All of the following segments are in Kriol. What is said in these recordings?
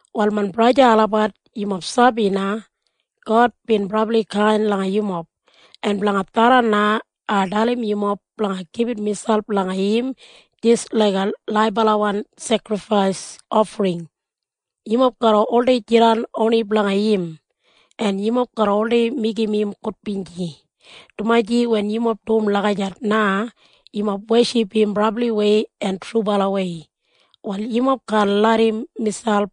Wal main braja en sista olabat, yumob sabi na God bin brabli kain langa yumob, en blanga tharran na ai dalim yumob blanga gibit miselp langa im jis laiga laibalawan sekrifais ofring. Yumob garra oldei jidan oni blanga im, en yumob garra oldei meigim im gudbinji, dumaji wen yumob dum lagijat na, yumob weship im brabliwei en trubalawei. Wal yumob kaan larram miselp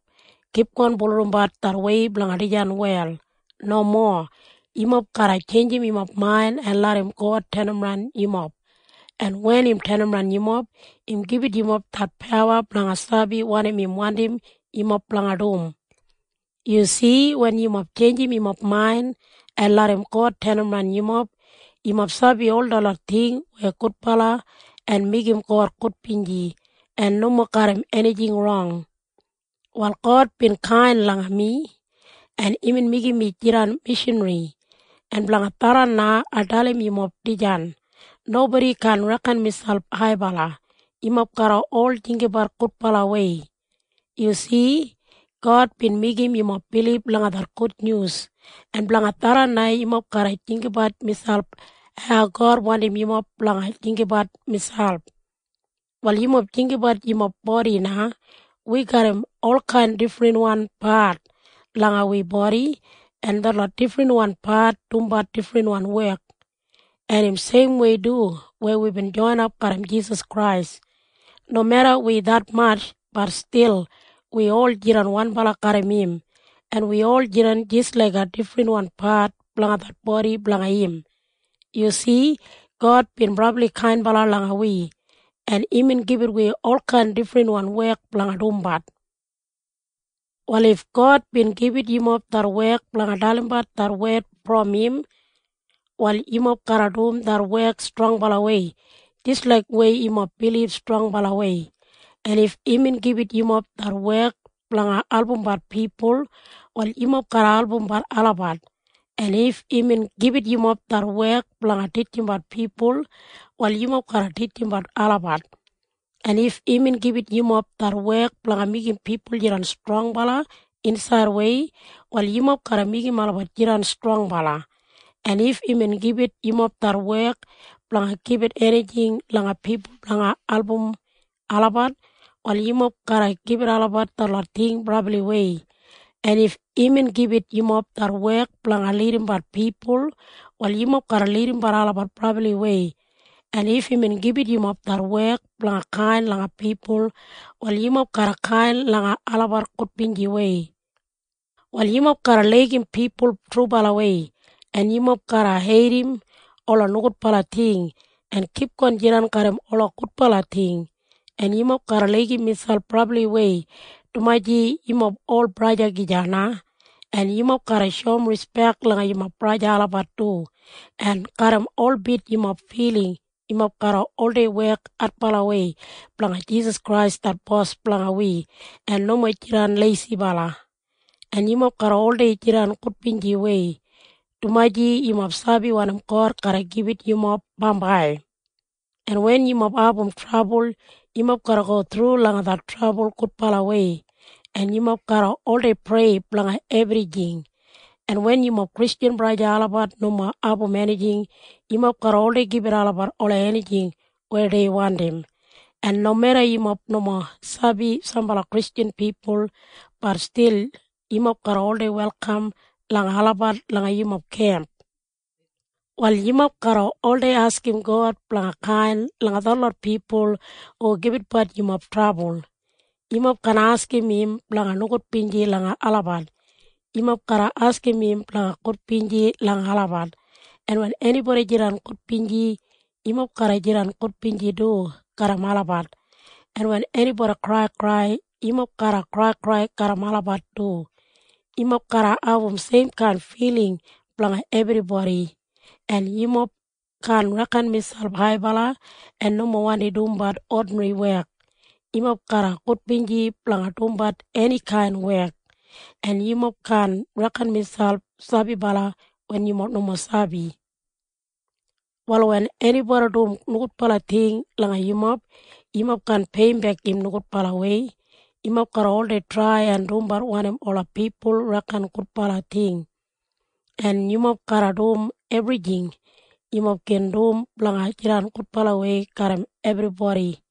kipgon bulurrumbat det wei blanga dijan wel. Nomo. Yumob garra tjeinjim yumob main en larram God tenimran yumob, en wen im tenimran yumob, im gibit yumob det pawa blanga sabi wanim im wandim yumob blanga dum. Yu si? Wen yumob tjeinjim yumob main en larram God tenimran yumob, yumob sabi ol detlot ting weya gudbala en meigim God gudbinji en nomo garram enijing rong. Wal God bin kain langa mi, en imbin meigim mi jidan mishanri, en blanga tharran na ai dalim yumob dijan. Nobodi kaan reken miselp haibala. Yumob garra ol jinggabat gudbalawei. Yu si? God bin meigim yumob bilib langa det gudnyus, en blanga tharran na yumob garra jinggabat miselp hau God wandim yumob blanga jinggabat. Wal yumob jinggabat yumob bodi na. Wi garram olkain difrinwan pat langa wi bodi, en detlot difrinwan pat dumbat difrinwan wek. En im seimwei du weya wibin joinap garram Jisas Krais. Nomeda wi detmatj, bat stil wi ol jidan wanbala garram im, en wi ol jidan jis laiga difrinwan pat blanga det bodi blanga im. Yu si? God bin brabli kainbala langa wi, en imbin gibit wi olkain difrinwan wek blanga dumbat. Wal if God bin gibit yumob det wek blanga dalimbat det wed brom im, wal yumob garra dum det wek strongbalawei jis laik weya yumob bilib strongbalawei. En if imbin gibit yumob det wek blanga albumbat pipul, wal yumob garra albumbat olabat. En if imbin gibit yumob det wek blanga titjimbat pipul, wal yumob garra titjimbat olabat. En if imbin gibit yumob det wek blanga meigim pipul jidan strongbala insaidwei, wal yumob garra meigim olabat jidan strongbala. En if imbin gibit yumob det wek blanga gibit enijing langa pipul blanga album olabat, wal yumob garra gibit olabat detlot ting brabliwei. En if imbin gibit yumob det wek blanga lidimbat pipul, wal yumob garra lidimbat olabat brabliwei. En if imbin gibit yumob det wek blanga kain langa pipul, wal yumob garra kain langa olabat gudbinjiwei. Wal yumob garra laigim pipul trubalawei. En yumob garra heidim ola nogudbala ting en kipgon jidan garram ola gudbala ting. En yumob garra laigim miselp brabliwei dumaji yumob ol baba gija na. En yumob garra shoum rispek langa yumob baba olabat du. En garram holbit yumob filing yumob garra oldei wek adbalawei blanga Jisas Krais det Bos blanga wi en nomo jidan leisibala. En yumob garra oldei jidan gudbinjiwei, dumaji yumob sabi wanim God garra gibit langa yumob bambai. En wen yumob abum trabul, yumob garra go thru langa det trabul gudbalawei. En yumob garra oldei prei blanga ebrijing. En wen yumob Kristjan braja en sista olabat nomo abum enijing, yumob garra oldei gibit olabat ola enijing weya dei wandim. En nomeda yumob nomo sabi sambala Kristjan pipul, bat stil yumob garra oldei welkam langa olabat langa yumob kemp. Wal yumob garra oldei askim God blanga kain langa detlot pipul hu gibitbat yumob trabul. Yumob kaan askim im blanga nogudbinji langa olabat. Yumob garra askim im blanga gudbinji langa olabat. En wen enibodi jidan gudbinji, yumob garra jidan gudbinji du garram olabat. En wen enibodi kraikrai, yumob garra kraikrai garram olabat du. Yumob garra abum seimkain filing blanga ebribodi. En yumob kaan reken miselp haibala en nomo wandi dumbat odinri wek. Yumob garra gudbinji blanga dumbat enikain wek. En yumob kaan reken miselp sabibala wen yumob nomo sabi brabliwei. Wal wen enibodi dum nogudbala ting langa yumob, yumob kaan peiyimbek im nogudbalawei. Yumob garra oldei trai en dumbat wanim ola pipul reken gudbala ting. En yumob garra dum ebrijing yumob gin dum blanga jidan gudbalawei garram ebribodi.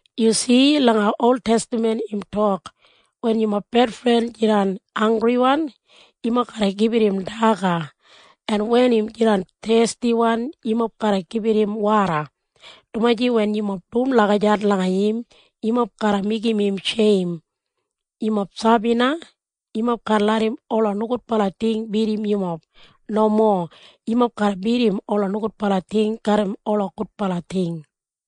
Yu si? Langa oltestaman im tok, “Wen yumob bedfren jidan hanggriwan, yumob garra gibit im daga, en wen im jidan thestiwan, yumob garra gibit im woda, dumaji wen yumob dum lagijat langa im, yumob garra meigim im sheim.” Yumob sabi na? Yumob kaan larram ola nogudbala ting bidim yumob. Nomo. Yumob garra bidim ola nogudbala ting garram ola gudbala ting.